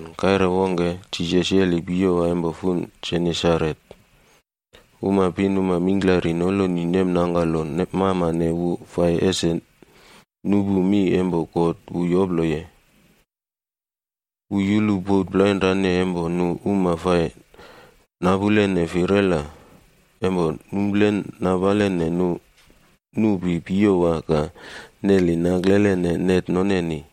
Kaire wongke, Jisas yeli piyowa empo fun Genesaret,a uma pinuma mingklari noloni nemnangkalo mamane wu fai ese nupu mi empo God wu yoploye. Wu yulu bot plainrane empo nu uma fai napulene firela, empo nuplen napalene nupi piyowa ka neli naklelene net noneni.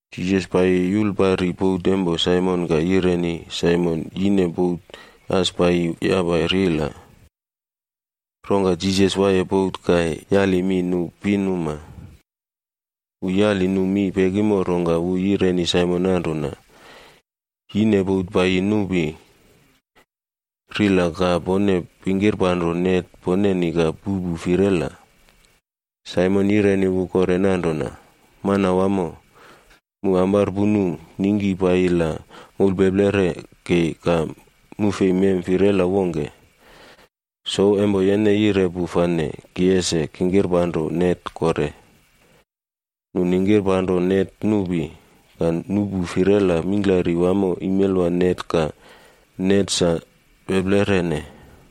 Jisas paiyi yulpari bot empo Saimon ka yaline Saimon ese yine bot as paiyi yapa rila. Rongka Jisas waiye bot ka yukule mi nu pinuma. Wu yali nu mi pekimo rongka wu yireni Saimon nanrona, “Yine bot paiyi nupi rila ka pone pingkipanro net poneni ka puꞌpu firela.” Saimon yireni wu kore nanrona, “Manwamo, mu amparpunu ningki paiyi la moulpeplere kei ka mu fei mem firela wongke. Souw empo yene yire pu fane ki ese kingkipanro net kore.” Nu ningkipanro net nupi, ka nuꞌpu firela mingklari wamo imelwa net ka net sa peplerene.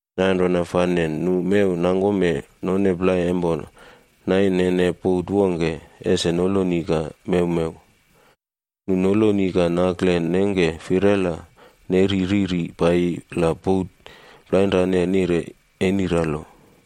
Nanrona fane nu mew nangkome none plai empo nainene bot wongke ese noloni ka mewmew. Nu noloni ka nakle nengke firela neri riri paiyi la bot plainrane nire eniralo.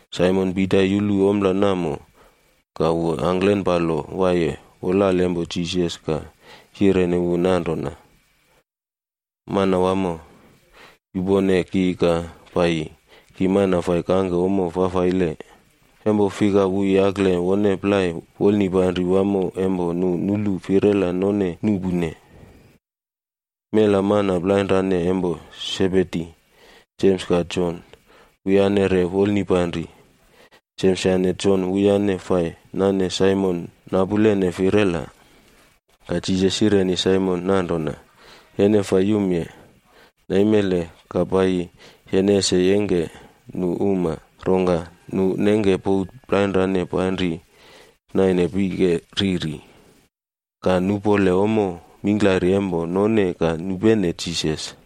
Saimon Pita yulu ompla namo, ka wu angklenpalo waiye wolale empo Jisas ka yireni wu nanrona, “Manwamo, yupone ki ka paiyi, ki mana fai kangke ommo fafaile.” Empo fika wu yakle wone plai wolnipanri wamo empo nu nulu firela none nuꞌpune. Mela mana plainrane empo Sebedi, Jems ka Jon, wuyane re wolnipanri. Jems yane Jon wuyane fai nane Saimon napulene firela. Ka Jisas yireni Saimon nanrona, “Yene fai yumye. Naimele ka paiyi, yene ese yengke nu uma.” Rongka nu nengke bot plainrane panri naine pike riri, ka nupole ommo mingklari empo none ka nupene Jisas.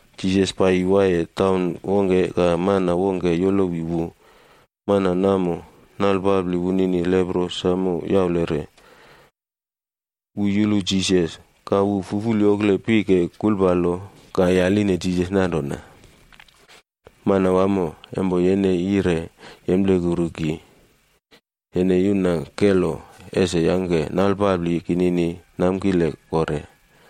Jisas paiyi waiye taun wongke ka mana wongke yolowi wu. Mana namo, nalpapli wunini lepro samo yaulere. Wu yulu Jisas, ka wu fuful yokle pike kulpalo ka yaline Jisas nanrona, “Manwamo, empo yene yire yemplekuru ki, yene yuna kelo ese yangke nalpapli kinini namkileb kore.”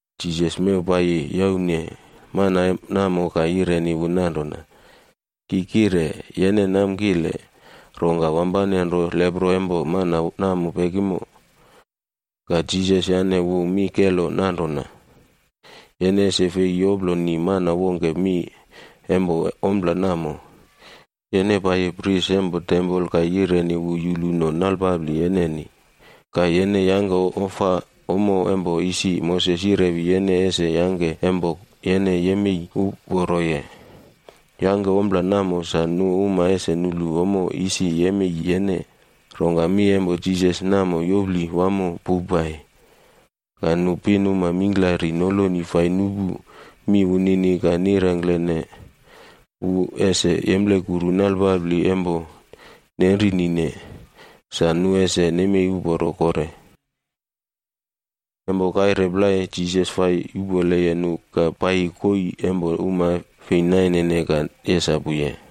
Jisas mew paiyi yaune mana namo ka yireni wu nanrona, “Ki kire, yene namkile.” Rongka wampane nro lepro empo mana namo pekimo. Ka Jisas yane wu mi kelo nanrona, “Yene ese fei yoploni mana wongke mi empo ompla namo. Yene paiyi pris empo tempol ka yireni wu yuluno nalpapli yeneni, ka yene yangke ofa ommo empo isi Moses yirewi yene ese yangke empo yene yemei uporoye. Yangke ompla namo sa nu uma ese nulu ommo isi nemei yene.” Rongka mi empo Jisas samo yopli wamo powpai. Ka nu pinuma mingklari noloni fai nupu mi wunini ka ringklene wu ese yemplekuru nalpapli empo nenrinine sa nu ese nemei uporo kore. Empo kaire plai Jisas fai yupoleye nu ka paiyi koii empo uma fei nainene ka yesapuye.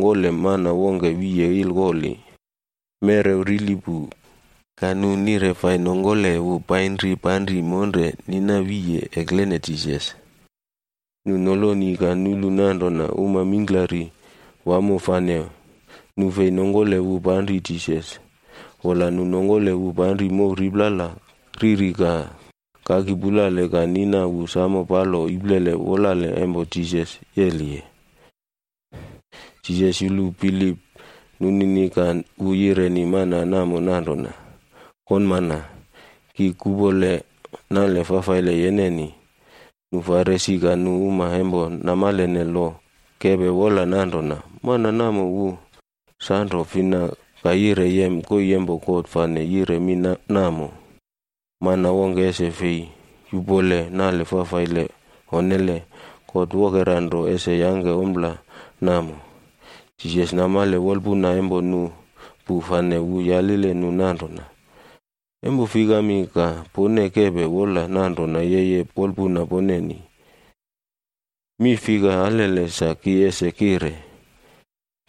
Ka nu uma plai nongkole mana wongke wiye ilkoli, merew wunini rili pu, ka nu nire fai nongkole wu painri panri monre nina wiye eklene Jisas. Nu noloni ka nulu nanrona uma mingklari wamo fane nu fei nongkole wu panri Jisas, wola nu nongkole wu panri mow riplala riri ka kaki pulale ka nina wu samo palo iplele wolale empo Jisas yeliye. Jisas yulu bilip nunini ka wu yireni mana namo nanrona, “Konmana, ki kupole nale fafaile yeneni.” Nu Farisi ka nu uma empo namalene loc kepe wola nanrona, “Mana namo wu sanro fina ka yire yem koii empo God fane yire mi namo? Mana wongke ese fei yuꞌpole nale fafaile. Onnele. God wokera nro ese yangke ompla namo.” Jisas namale wolpuna empo nu pu fane wu yalile nu nanrona, “Empo fikami ka pone kepe wola nanrona yeye wolpuna poneni? Mi fika alele sa ki ese kire?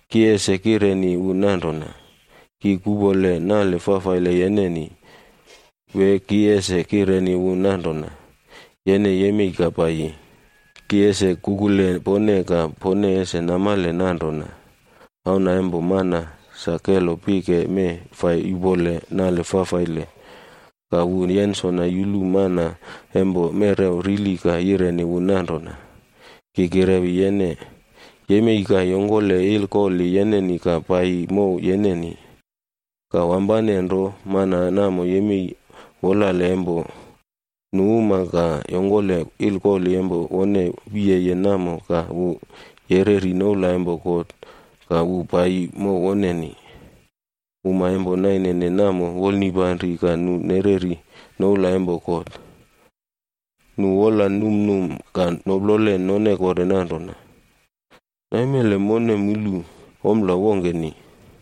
Ki ese kireni wu nanrona, ‘Ki kupole nale fafaile yeneni,’ wee ki ese kireni wu nanrona, ‘Yene yemei ka paiyi’? Ki ese kukule pone ka pone ese namale nanrona, Auna empo Mana sa kelo pike mee fai yuꞌpole nale fafaile.” Ka wu yensona yulu mana empo merew rili ka yireni wu nanrona, “Ki kirewi yene, yemei ka yongkole ilkoli yeneni ka paiyi mow yeneni.” Ka wampane nro mana namo yemei wolale empo nu uma ka yongkole ilkoli empo wone wiyeye namo ka wu yereri noula empo God ka wu paiyi mow woneni. Uma empo nainene namo wolnipanri ka nu nereri noula empo God. Nu wola numnum ka noplole none kore nanrona, “Naimele mone mulu ompla wongkeni!”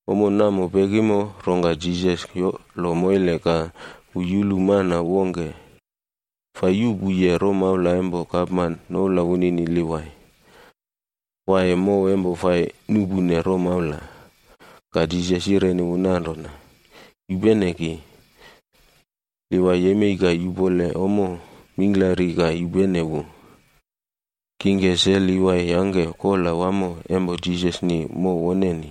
Ommo namo pekimo rongka Jisas yolo moile ka wu yulu mana wongke fai yuꞌpuye romaula empo gapman noula wunini Livai,d waiye mow empo fai nuꞌpune romaula. Ka Jisas yireni wu nanrona, “Yupene ki.” Livai yemei ka yupole ommo mingklari ka yupene wu. Rongka Livai yangke kola wamo empo Jisasni mow woneni.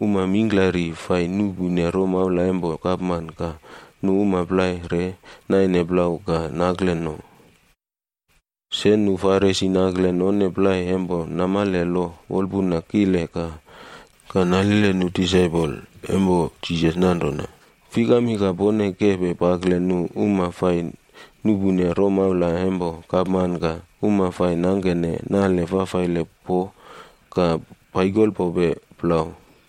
Uma mingklari fai nuꞌpune romaula empo gapman ka nu uma plai re naine plau ka nakle no. Se nu Farisie nakle none plai empo namale lo wolpuna kile ka nalile nu disaipol empo Jisas nanrona, “Fikami ka pone kepe pakle nu uma fai nuꞌpune romaula empo gapman ka uma fai nangkene nale fafaile po ka paikolpope plau?”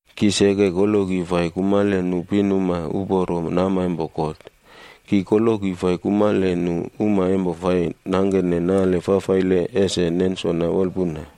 Ki seke koloki fai kumale nu pinuma uporo nama empo God. Ki koloki fai kumale nu uma empo fai nangkene nale fafaile ese nensona wolpuna.”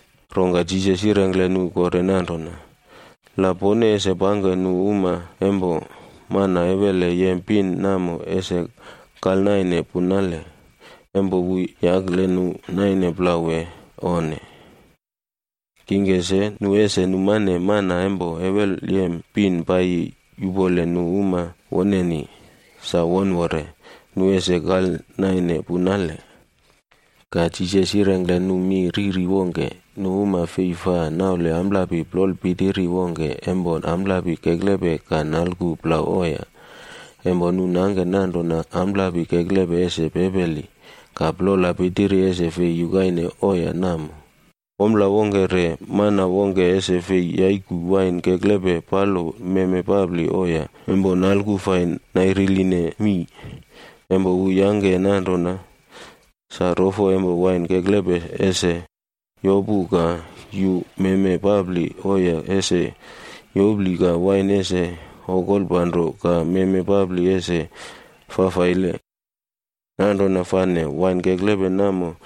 Rongka Jisas yirengkle nu kore nanrona, “La pone ese pangke nu uma empo mana ewele yem pin namo ese kalnaine punale, empo wu yakle nu naine plau wee onne? Kingke se, nu ese numane mana empo ewelyem pin paiyi yupole nu uma woneni, sa wonwore, nu ese kalnaine punale.” Ka Jisas yirengkle nu mi riri wongke. “Nu uma fei fa naule amplapi plola pitiri wongke empo amplapi keklepe ka nalku plau oya. Empo nu nangke nanrona amplapi keklepe ese pepeli, ka plola pitiri ese fei yukaine oya namo. Ompla wongke re, mana wongke ese fei yaiku wain keklepe palo meme papli oya empo nalku fai nairiline mii. Empo wu yangke nanrona, sa rofo empo wain keklepe ese yopu ka yuu meme papli oya ese yopli ka wain ese okolpanro ka meme papli ese fafaile. Nanrona fane wain keklepe namo,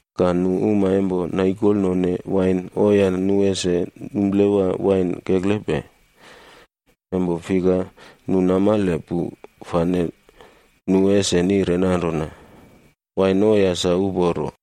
Ka nu uma empo naikolnone wain oya nu ese numplewa wain keklepe, empo fika nu namale pu fane nu ese nire nanrona, ‘Wain oya sa uporo.’”